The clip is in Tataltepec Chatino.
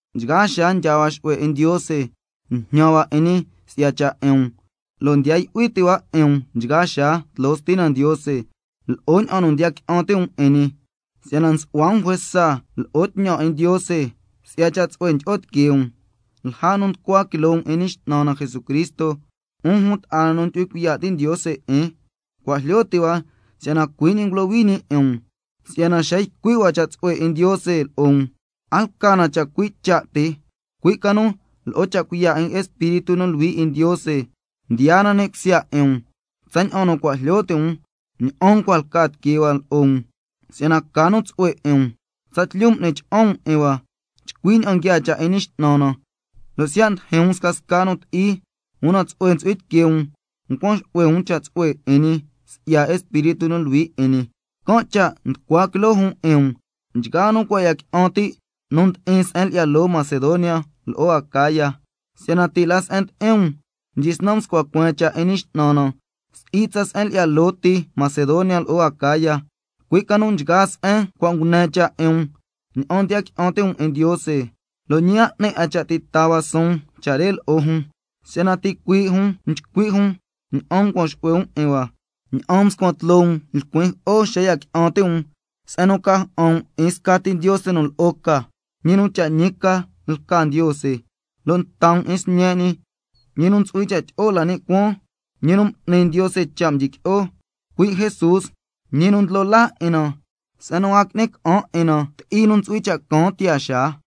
Nchgaa xaa ndyaa hua xu'hue 'in Ndiose, njñan hua 'in ñi si'ya cha' 'in um, lo' ndiya yu'hui ti' hua 'in um nchgaa xaa tloo Stina Ndiose lo'o ña'an nu ndiya qui'an ti' um 'in ñi, si'yana nsu'hua um juesa lo'o tñan 'in Ndiose si'ya cha' tsu'hue ndyi'o tiquee um, lja nu nducua quiloo um 'in Ñi X'nan na Jesucristo. 'Un jun ta'a na nu ndyu'hui cuiya' ti' Ndiose 'in, cua' jlyo ti' hua si'yana cui' ñi ngulohui ñi 'in um, si'yana xa ycui' hua cha' tsu'hue 'in Ndiose lo'o um, a lca na chacui' cha' ti, cui' ca nu lo'o cha' cuiya' 'in Espíritu nu Luhui 'in Ndiose mdiyaa na ni' cusya 'in um, tsaña'an nu cua' jlyo ti' um ña'an ncua lca tiquee hua lo'o um si'yana ca nu tsu'hue 'in um. Tsatlyu m'ni cha'an um 'in hua chcui ña'an nguiaa cha' 'in Ñi X'nan na, lo' siya' ndijin um scasca nu ti'i, una tsu'hue ntsu'hui tiquee um ncuan xu'hue um cha' tsu'hue 'in ñi si'ya Espíritu nu Luhui 'in ñi, can' cha' nducua quiloo jun 'in um, nchgaa nu cua' ya qui'an ti' nu ndi'in se'en lyi'ya loo Macedonia lo'o Acaya. Si'yana ti' la se'en ndi'in um mdyisnan mscua cueen cha' 'in Ñi X'nan na, si'i tsa se'en lyi'ya loo ti Macedonia lo'o Acaya, cui' ca nu nchgaa se'en cua' ngune cha' 'in um ña'an ndiya qui'an ti' um 'in Ndiose, lo' ñi a 'ni 'a cha' ti' taa hua suun cha' re lo'o jun, si'yana ticuii' jun nchcui' jun ña'an ncuan xu'hue um 'in hua, ña'an mscuan tloo um lcuin jo'o xa ya qui'an ti' um, ña'an ca si'yana ca ja'an um 'in scati Ndiose nu lo'o ca, ñi nu cha' ñi ca lca Ndiose, cuaña'an nta um 'in Sñe' ñi nu ntsu'hui cha' tyi'o la ni' cuaan, ñi nu m'ni Ndiose cha' mdyiqui'o, cui' Jesús, ñi nu ndlo laa 'in na se'en nu a qui'ni ca'an 'in na ti'i nu ntsu'hui cha' caan tiyaa xaa.